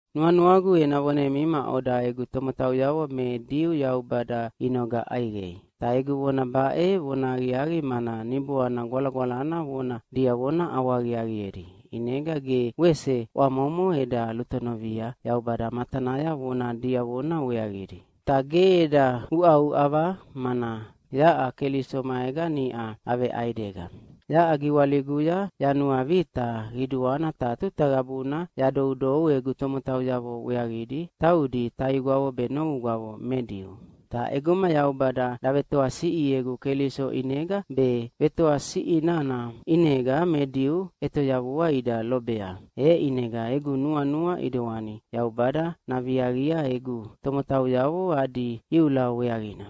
Nuanuagu ena vonemi maʼoda egu tomotauyavo me Diu Yaubada inoga ʼaiqei. Ta egu vona baʼe vonahaqiaqi mana Niboana Gwalagwalana vona diavona ʼawahaqiaqiedi, ʼinega ge wese ʼwamomo eda lutonovia Yaubada matanaya vona diavona weaqidi. Ta ge eda uʼauʼava, mana yaʼa Keliso maega niʼa aveʼaidega. Yaʼa giwaliguya yanuavita qiduana ta tuta qabuna yadoudou egu tomotauyavo weaqidi, taudi taigwavo be novugwavo me Diu. Ta ʼeguma Yaubada davetoasiʼiegu Keliso ʼinega be vetoasiʼi nana ʼinega me Diu ʼetoyavua ida lobea, e ʼinega egu nuanua ʼidewani Yaubada naviaqia egu tomotauyavo adi iula weaqina.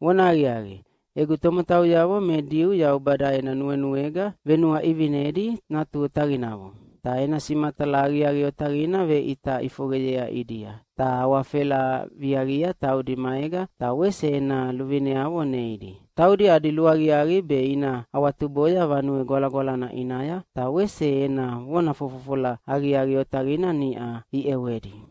Vonahaqiaqi, egu tomotauyavo me Diu Yaubada ena nuenuega venuaʼivinedi natu otaqinavo. Ta ena simatala aqiaqi otaqina veʼita ʼifoqeyea ʼidia. Ta awafela viaqia taudi maega, ta wese ena luvineavo neidi. Taudi adi luaqiaqi be ina awatuboya Vanue Gwalagwalana ʼinaya, ta wese ena vona fofofola aqiaqi otaqidi niʼa iʼewedi.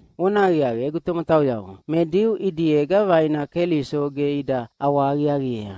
Vonahaqiaqi, egu tomotauyavo me Diu ʼidiega vaina Keliso ge ida ʼawahaqiaqiea.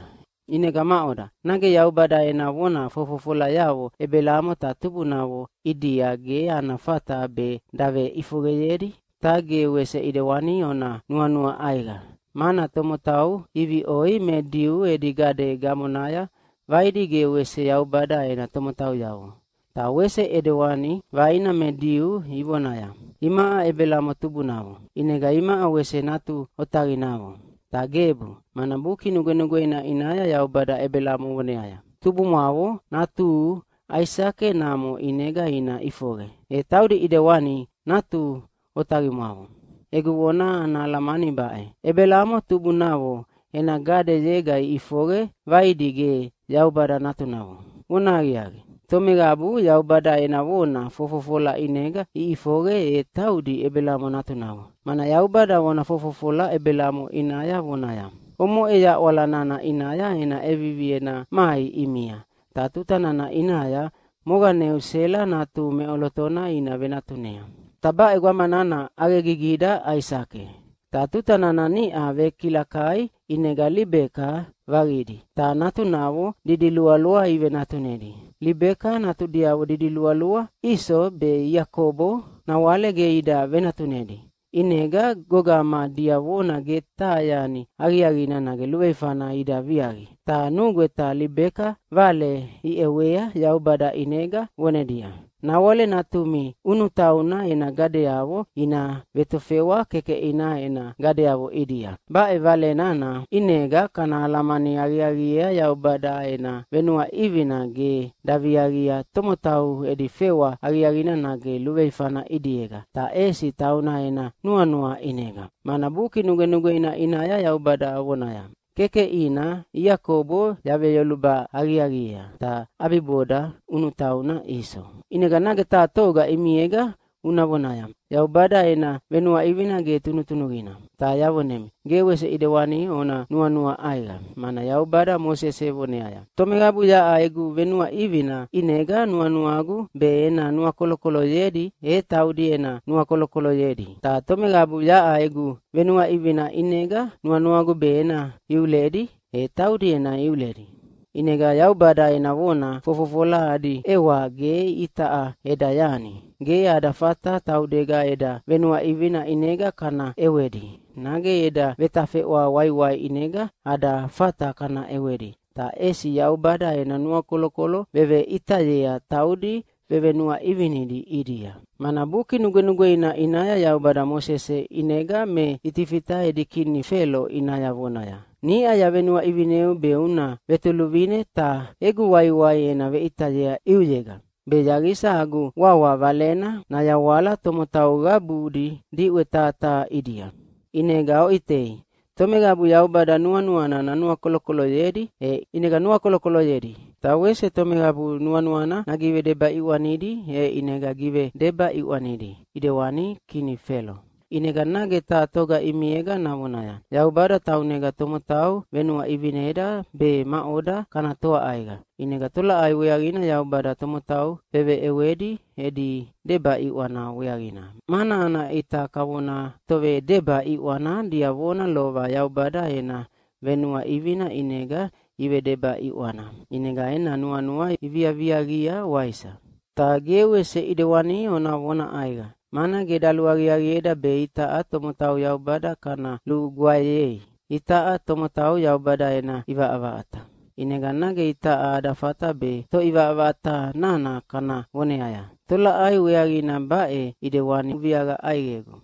ʼInega maʼoda, nage Yaubada ena vona fofofolayavo Ebelamo ta tubunavo ʼidia ge ana fata be daveʼifoqeyedi? Ta ge wese ʼidewani ona nuanua ʼaiqa, mana tomotau iviʼoi me Diu edi gade gamonaya vaidi ge wese Yaubada ena tomotauyavo. Ta wese ʼidewani vaina me Diu ivonaya, “Imaʼa Ebelamo tubunavo, ʼinega imaʼa wese natu otaqinavo!” Ta gebu, mana Buki Nugwenugweina ʼinaya Yaubada Ebelamo voneaya, “Tubumwavo natuhu Aisake namo ʼinega ina ʼifoqe, e taudi ʼidewani natu otaqimwavo.” Egu vona ana alamani baʼe: Ebelamo tubunavo ena gadeyega iʼifoqe vaidi ge Yaubada natunavo. Vonahaqiaqi, tomeqabu Yaubada ena vona fofofola ʼinega iʼifoqe, e taudi Ebelamo natunavo. Mana Yaubada vona fofofola Ebelamo ʼinaya vonaya, “Omoʼe yaʼwala nana ʼinaya ena ʼevivi ena mai ʼimia, ta tuta nana ʼinaya moqaneu Sela natuhu meʼolotona ina venatunea.” Ta baʼe gwama nana ʼaqegigida Aisake. Ta tuta nana niʼa vekilakai ʼinega Libeka vaqidi, ta natunavo didilualua ivenatunedi. Libeka natudiavo didilualua Iso be Iakobo nawale ge ida venatunedi, ʼinega gogama diavona ge taha yani aqiaqina nage luveifana ida viaqi, ta nugweta Libeka vale iʼewea Yaubada ʼinega vonedia, “Nawale natumi ʼunutauna ena gadeyavo ina vetofewa kekeʼina ena gadeyavo ʼidia.” Baʼe vale nana ʼinega kana alamani aqiaqiea Yaubada ena venuaʼivina ge daviaqia tomotau edi fewa aqiaqina nage luveifana ʼidiega, ta ʼesi tauna ena nuanua ʼinega. Mana Buki Nugwenugweina ʼinaya Yaubada vonaya, “Kekeʼina Iakobo yaveyoluba aqiaqiea, ta ʼabiboda ʼunutauna Iso.” ʼInega nage taha toga ʼimiega una vonaya, “Yaubada ena venuaʼivina ge tunutunuqina!” Ta yavonemi, ge wese ʼidewani ona nuanua ʼaiqa, mana Yaubada Mosese voneaya, “Tomeqabu yaʼa egu venuaʼivina ʼinega nuanuagu be ena nuakolokoloyedi, e taudi ena nuakolokoloyedi. Ta tomeqabu yaʼa egu venuaʼivina ʼinega nuanuagu be ena iuledi, e taudi ena iuledi.” ʼInega Yaubada ena vona fofofola adi ʼewa ge itaʼa eda yani. Ge ada fata taudega eda venuaʼivina ʼinega kana ʼewedi, nage eda vetafeʼwa waiwai ʼinega ada fata kana ʼewedi, ta ʼesi Yaubada ena nuakolokolo veveʼitayea taudi vevenuaʼivinidi ʼidia. Mana Buki Nugwenugweina ʼinaya Yaubada Mosese ʼinega me Itifita edi kini Felo ʼinaya vonaya, “Niʼa yavenuaʼivineu be una vetoluvine ta egu waiwai ena veʼitayea ʼiuyega, be yaqisa agu wawa Valena nayawala tomotau qabudi diʼwe taha taha ʼidia.” ʼInega oʼitei, tomeqabu Yaubada nuanuana nanuakolokoloyedi, e ʼinega nuakolokoloyedi, ta wese tomeqabu nuanuana nagivedeba ʼiʼwanidi, e ʼinega givedeba ʼiʼwanidi ʼidewani kini Felo. ʼInega nage taha toga ʼimiega navonaya, “Yaubada taunega tomotau venuaʼivineda be maʼoda kana toa ʼaiqa. ʼInega tolaʼai weaqina Yaubada tomotau veveʼewedi edi deba ʼiʼwana weaqina, mana ana ʼita kavona tovedeba ʼiʼwana diavona lova Yaubada ena venuaʼivina ʼinega ivedeba ʼiʼwana, ʼinega ena nuanua iviaviaqia, waisa?” Ta ge wese ʼidewani ona vona ʼaiqa! Mana ge daluaqiaqieda be itaʼa tomotau Yaubada kana lugwaeyei! Itaʼa tomotau Yaubada ena ʼivaʼavaʼata. ʼInega nage itaʼa ada fata be Toʼivaʼavaʼata nana kana voneaya, “Tolaʼai weaqina baʼe ʼidewani uviaqa ʼaiqegu?”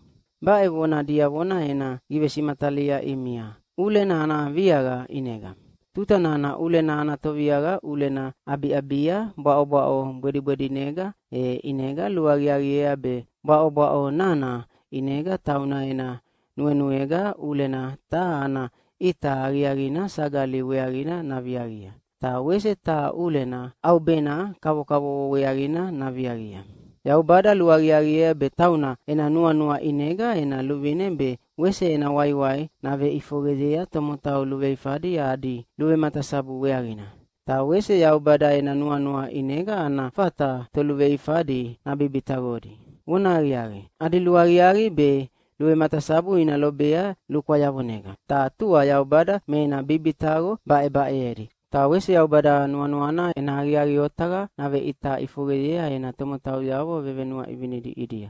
Baʼe vona diavona ena givesimatalia ʼimia ʼulena ana viaqa ʼinega. Tuta nana ʼulena ana toviaqa ʼulena ʼabiʼabia bwaʼobwaʼo bwedibwedinega, e ʼinega luaqiaqiea be bwaʼobwaʼo nana ʼinega tauna ena nuenuega ʼulena taha ana ʼita aqiaqina sagali weaqina naviaqia, ta wese taha ʼulena ʼaubena kavokavovo weaqina naviaqia. Yaubada luaqiaqiea be tauna ena nuanua ʼinega ena luvine be wese ena waiwai naveʼifoqeyea tomotau luveifadi adi luvematasabu weaqina. Ta wese Yaubada ena nuanua ʼinega ana fata toluveifadi nabibitaqodi. Vonahaqiaqi, adi luaqiaqi be luvematasabu ina lobea lukwayavonega, ta tua Yaubada me ena bibitaqo baʼebaʼeyedi. Ta wese Yaubada nuanuana ena aqiaqi otaqa naveʼita ʼifoqeyea ena tomotauyavo vevenuaʼivinidi ʼidia,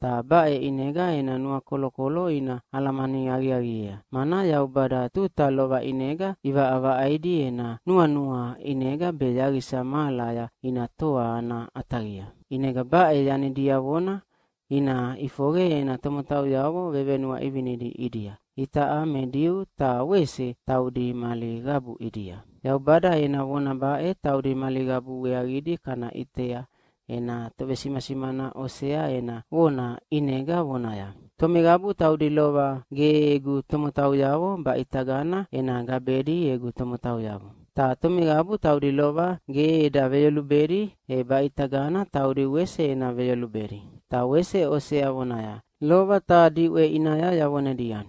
ta baʼe ʼinega ena nuakolokolo ina alamani aqiaqiea, mana Yaubada tuta lova ʼinega ʼivaʼavaʼaidi ena nuanua ʼinega be yaqisa mahalaya ina toa ana ʼataqia. ʼInega baʼe yani diavona ina ʼifoqe ena tomotauyavo vevenuaʼivinidi ʼidia, itaʼa me Diu ta wese taudi mali qabu ʼidia. Yaubada ena vona baʼe taudi mali qabu weaqidi kana ʼitea ena tovesimasimana Osea ena vona ʼinega vonaya, “Tomeqabu taudi lova ge egu tomotauyavo, baʼitagana ena gabedi egu tomotauyavo. Ta tomeqabu taudi lova ge eda veyolubedi, e baʼitagana taudi wese ena veyolubedi.” Ta wese Osea vonaya, “Lova taha diʼwe ʼinaya yavonedia,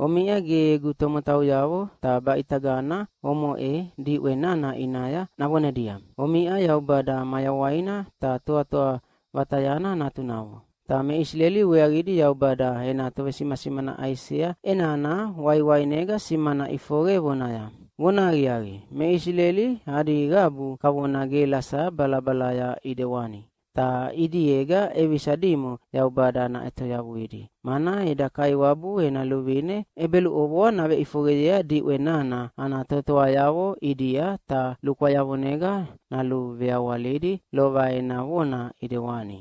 ‘Omiʼa ge egu tomotauyavo.’ Ta baʼitagana omoʼe diʼwe nana ʼinaya navonedia, ‘Omiʼa Yaubada mayawaina ta Toatoa Vatayana natunavo.’” Ta me Isileli weaqidi Yaubada ena tovesimasimana Aisea ʼenana waiwainega simana ʼifoqe vonaya, “Vonahaqiaqi, me Isileli adi qabu kavona gelasa balabalaya ʼidewani, ta ʼidiega ʼevisa dimo Yaubada naʼetoyavuidi, mana eda Kaiwabu ena luvine ʼebeluʼovoa naveʼifoqeyea diʼwe nana ana totoayavo ʼidia ta lukwayavonega naluveawalidi lova ena vona ʼidewani.”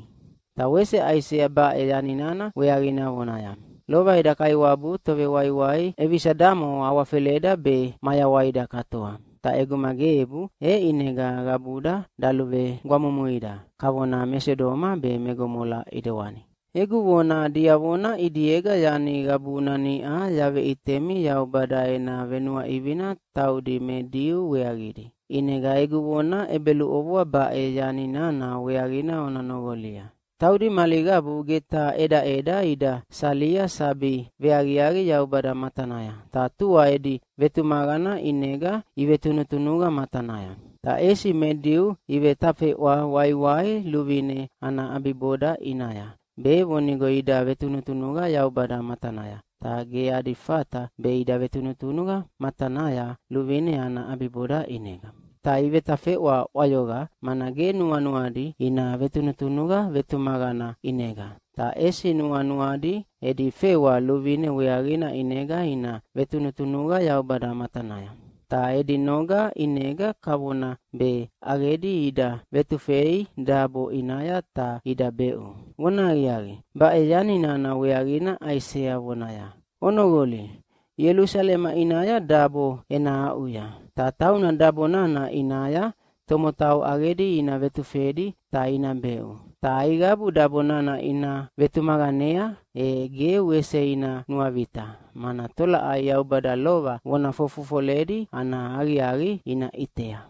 Ta wese Aisea baʼe yani nana weaqina vonaya, “Lova eda Kaiwabu Tovewaiwai ʼevisa damo awafeleda be mayawaida katoa. Ta ʼeguma gebu, e ʼinega qabuda daluvegwamumuida kavona me Sodoma be me Gomola ʼidewani.” Egu vona diavona ʼidiega yani qabuna niʼa yaveʼitemi Yaubada ena venuaʼivina taudi me Diu weaqidi. ʼInega egu vona ʼebeluʼovoa baʼe yani nana weaqina ona noqolia. Taudi mali qabu ge taha ʼedaʼeda ida salia sabi veaqiaqi Yaubada matanaya, ta tua edi vetumaqana ʼinega ivetunutunuqa matanaya. Ta ʼesi me Diu ivetafeʼwa waiwai luvine ana ʼabiboda ʼinaya, be vonigo ida vetunutunuqa Yaubada matanaya, ta ge adi fata be ida vetunutunuqa matanaya luvine ana ʼabiboda ʼinega. Ta ivetafeʼwa ʼwayoqa, mana ge nuanuadi ina vetunutunuqa vetumaqana ʼinega, ta ʼesi nuanuadi edi fewa luvine weaqina ʼinega ina vetunutunuqa Yaubada matanaya. Ta edi noga ʼinega kavona be ʼaqedi ida ʼevetufei dabo ʼinaya ta ida beʼu. Vonahaqiaqi, baʼe yani nana weaqina Aisea vonaya, “Onoqoli, Ielusalema ʼinaya dabo ena aʼuya, ta tauna dabo nana ʼinaya tomotau ʼaqedi ina vetufedi ta ina beʼu. Ta aiqabu dabo nana ina vetumaqanea, e ge wese ina nuavita, mana tolaʼai Yaubada lova vona fofofoledi ana aqiaqi ina ʼitea.”